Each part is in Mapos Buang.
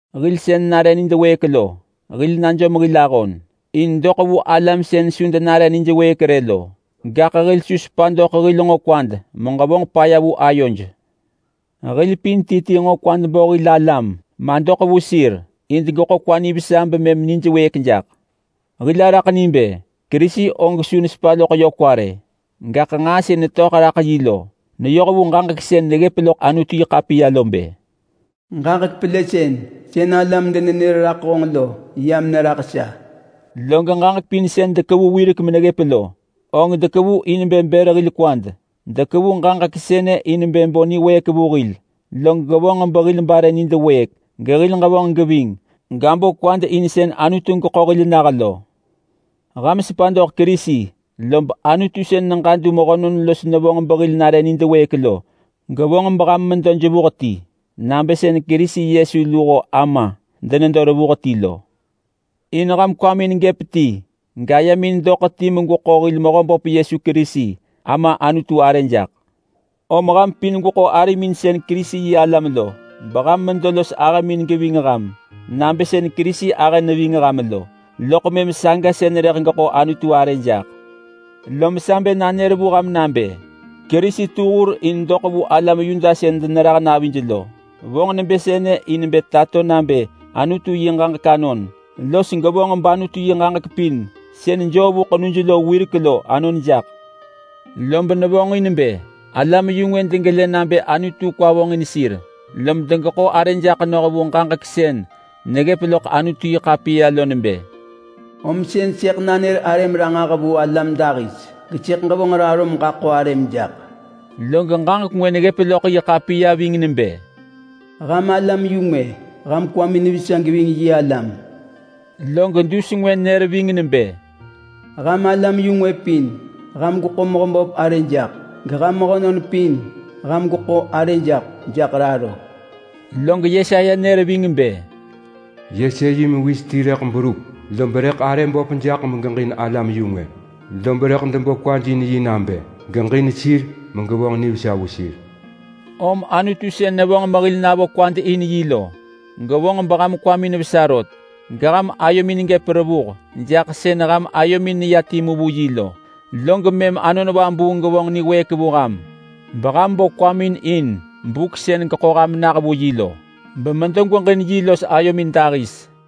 Hil sën nare nid wëëk lo, hil najom hil ahon in doḳ vu alam sën su denare nij wëëk rë lo. Gaḳ hil su sepa doḳ hil nġo kwad meġevonġ paya vu ayoj. Hil pin ti ti nġo kwad bo hil alam madoḳ vu sir in degeḳo kwa nivesa bemëm nij wëëk jaḳ. Hil araḳ ni bë Kerisi og su nesepa loḳ yö kwa rë. Gaḳ nġaa sën netöḳ raḳ yi lo neyoh vu ġaġek sën neggëp loḳ Anutu-yi-ḳapiya lo bë, “Ġaġek pelësën sën alam denenër raḳ honġ lo yam neraḳ sa.” Log ġaġek pin sën dekevu wirek meneggëp lo, og dekevu in bë bër hil kwad. Dekevu ġaġek sënë in bë bo niwëëk vu hil, log gevonġ behil bare nid wëëk, gehil ġevonġ geving, gabo kwad in sën Anutu geḳo hil nah lo. Ham sepa doḳ Kerisi lob Anutu sën neġadu mehönon los nevonġ behil nare nid wëëk lo gevonġ beham medo jevuh ti nabë sën Kerisi Yesu luho Ama denedo revuh ti lo. In ham kwamin gëp ti gayemin doḳ ti megweḳo hil Mehöhöp Yesu Kerisi Ama Anutu arë jaḳ. Om ham pin gweḳo arimin sën Kerisi-yi-alam lo beham medo los ahëmin geving ham nabë sën Kerisi ahë neving ham lo, loḳ mëm saga sën rëḳ geḳo Anutu arë jaḳ. Lom sa bë nanër vu ham nabë Kerisi tu hur in doḳ vu alam Yuda sën denerah navij lo. Vonġ nebë sënë in bë tato nabë Anutu yi ġaġek anon, los gevonġ bAnutu yi ġaġek pin sën joo vu ḳenuj lo wirek lo anon jaḳ. Lob nevonġ in bë alam-yu-ngwë degelë nabë Anutu kwa vonġin sir, lom degeḳo arë jaḳ noh vu ġaġek sën neggëp loḳ Anutu-yi-ḳapiya lo nebë: “Om sën sëḳ nanër arëm ranġah vu alam dahis. Gesëḳ ġevonġ raro meġaḳo arëm jaḳ.” Log ġaġek ngwë neggëp loḳ yi ḳapiya ving nebë: “Ham alam-yu-ngwë, ham kwamin vesa geving yi alam.” Log dus ngwë nër ving nebë: “Ham alam-yu-ngwë pin, ham gweḳo Mehöböp arë jaḳ. Geham mehönon pin, ham gweḳo arë jaḳ jaḳ raro.” Log Yesaya nër ving bë: “Yese yi mewis ti rëḳ berup, lob rëḳ arë böp jaḳ megeġin alam-yu-ngwë. Lob rëḳ debo kwaj in yi nabë geġin sir megevonġ nivesa vu sir.” Om Anutu sën nevonġ mehil navo kwad in yi lo gevonġ beham kwamin vesa rot, geham ayomin gëp revuh jaḳ sën ham ayomin neya timu vu yi lo. Log mëm Anon Vabuung gevonġ niwëëk vu ham, beham bo kwamin in buk sën geḳo ham nah vu yi lo bemedo gweġin yi los ayomin dahis.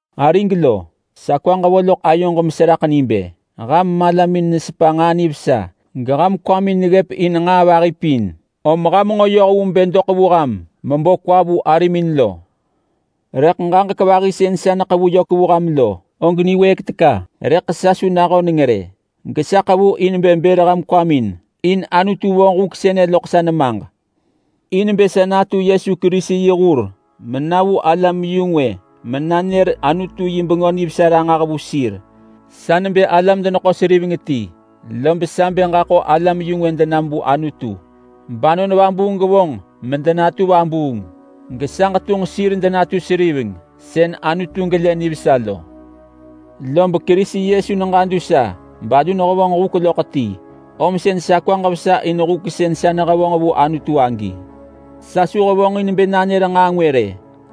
Arig lo, sa kwaġ vo loḳ ayoġ meseraḳ ni bë: Ham malamin nesepa nġaa nivesa geham kwamin neggëp in nġaa vahi pin, om ham nġo yoh vu bë doḳ vu ham mebo kwa vu arimin lo. Rëḳ ġaġek vahi sën sa neḳevu yök vu ham lo, og niwëëk teka. Rëḳ sa su nahöneng rë, gesa ḳevu in bë bër ham kwamin. In Anutu vonġ huk sënë loḳ sa nemaġ in bë sa natu Yesu Kerisi yi hur mena vu alam-yu-ngwë menanër Anutu yi Bengö Nivesa ranġah vu sir. Sa nebë alam-deneḳo-seriveng ti, lob sa bë ġaḳo alam-yu-ngwë denam vu Anutu bAnon Vabuung gevonġ medenatu vabuung gesa ġetunġ sir denatu seriveng sën Anutu gelë nivesa lo. Lob Kerisi Yesu neġadu sa balu nehevonġ huk loḳ ti, om sën sa kwaġ vesa in huk sën sa nehevonġ vu Anutu agi. Sa su hevonġin bë nanër nġaa ngwë rë,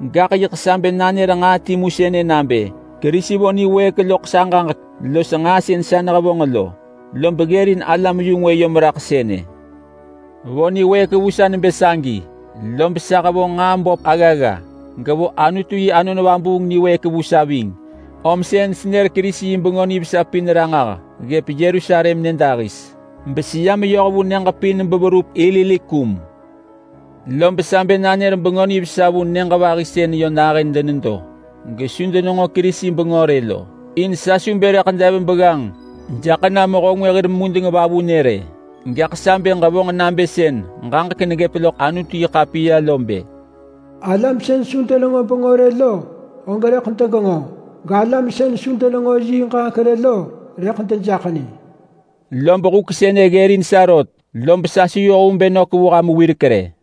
gaḳ yiḳ sa bë nanër nġaa timu sënë nabë: Kerisi vo niwëëk loḳ sa ġaġek los nġaa sën sa nehevonġ lo, lob ggërin alam-yu-ngwë yom raḳ sënë. Vo niwëëk vu sa nebë sagi, lob sa hevonġ nġaa böp aggagga. Gevo Anutu yi Anon Vabuung niwëëk vu sa ving. Om sën senër Kerisi yi Bengö Nivesa pin ranġah ggëp Yerusalem nyëdahis, beseya meyoh vu nyëġ pin beverup Ilirikum. Lob sa bë nanër Bengö Nivesa vu nyëġ vahi sën yö nahën denedo gesu denenġo Kerisi bengö rë lo, in sa su bë rëḳ dev begganġ jaḳ na mehö ngwë hir mudeng vavunë rë. Gaḳ sa bë ġevonġ nabë sën ġaġek neggëp loḳ Anutu-yi-ḳapiya lo bë: “Alam sën su denenġo bengö rë lo, og rëḳ degenġo. Galam sën su denenġo yi ġaġek rë lo, rëḳ dejaḳ ni.” Lob huk sënë ggërin sa rot, lob sa su yoh vu bë nök vu ham wirek rë.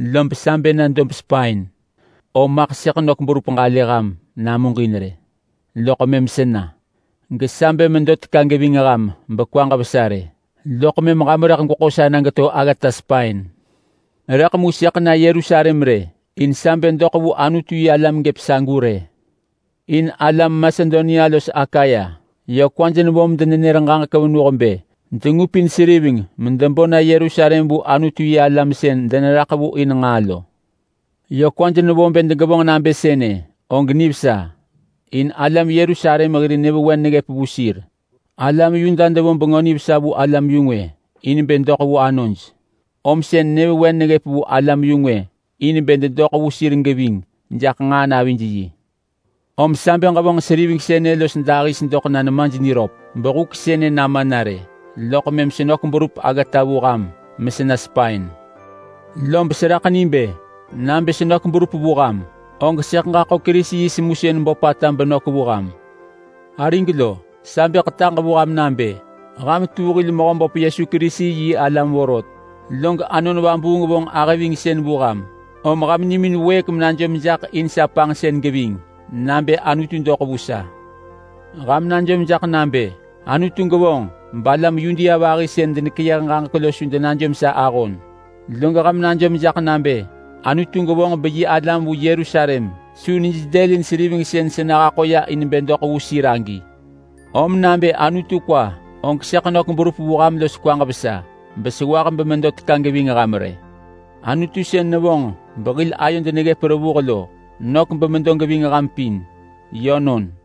lob sa bë na dob Spain, om maḳ sëḳ nök berup ġalë ham namuġin rë loḳ mëm sena. Gesa bë medo teka geving ham bekwaġ vesa rë, loḳ mëm ham rëḳ gweḳo sa na geto aggata Spain. Rëḳ mu sëḳ na Yerusalem rë, in sa bë doḳ vu Anutu-yi-alam gëp sagu rë. In alam Masedonia los Akaya yö kwaj nevo medenër ġaġek venuh bë dengupin seriveng medebo na Yerusalem vu Anutu-yi-alam sën deneraḳ vu in nġaa lo. Yö kwaj nevo bë degevonġ nabë sënë, og nivesa, in alam Yerusalem hir nyëvewen neggëp vu sir. Alam Yuda devo Bengö Nivesa vu alam-yu-ngwë in bë doḳ vu anoj, om sën nyëvewen neggëp vu alam-yu-ngwë in bë dedoḳ vu sir geving jaḳ nġaa navij yi. Om sa bë ġevonġ seriveng sënë los dahis doḳ na nemaj niröp behuk sënë nama na rë, loḳ mëm senök berup aggata vu ham mesena Spain. Lob seraḳ ni bë nabë senök berup vu ham, og sëḳ ġaḳo Kerisi yi semusën böpata benök vu ham. Arig lo, sa bë ḳetaġ vu ham nabë ham tu hil Mehöböp Yesu Kerisi yi alam vorot, log Anon Vabuung vonġ ahëvingsën vu ham, om ham nimin wëëk menajom jaḳ in sa panġsën geving nabë Anutu doḳ vu sa. Ham najom jaḳ nabë Anutu gevonġ balam Yudea vahi sën denekeyëh ġaġek lo su denajom sa ahon. Log ham najom jaḳ nabë Anutu gevonġ beyi alam vu Yerusalem su nij dëlin seriveng sën sa nehaḳo ya in bë doḳ vu sir agi. Om nabë Anutu kwa, og sëḳ nök berup vu ham los kwaġ vesa besewah memedo teka geving ham rë. Anutu sën nevonġ behil ayod neggëp revuh lo nök bemedo geving ham pin. Yönon.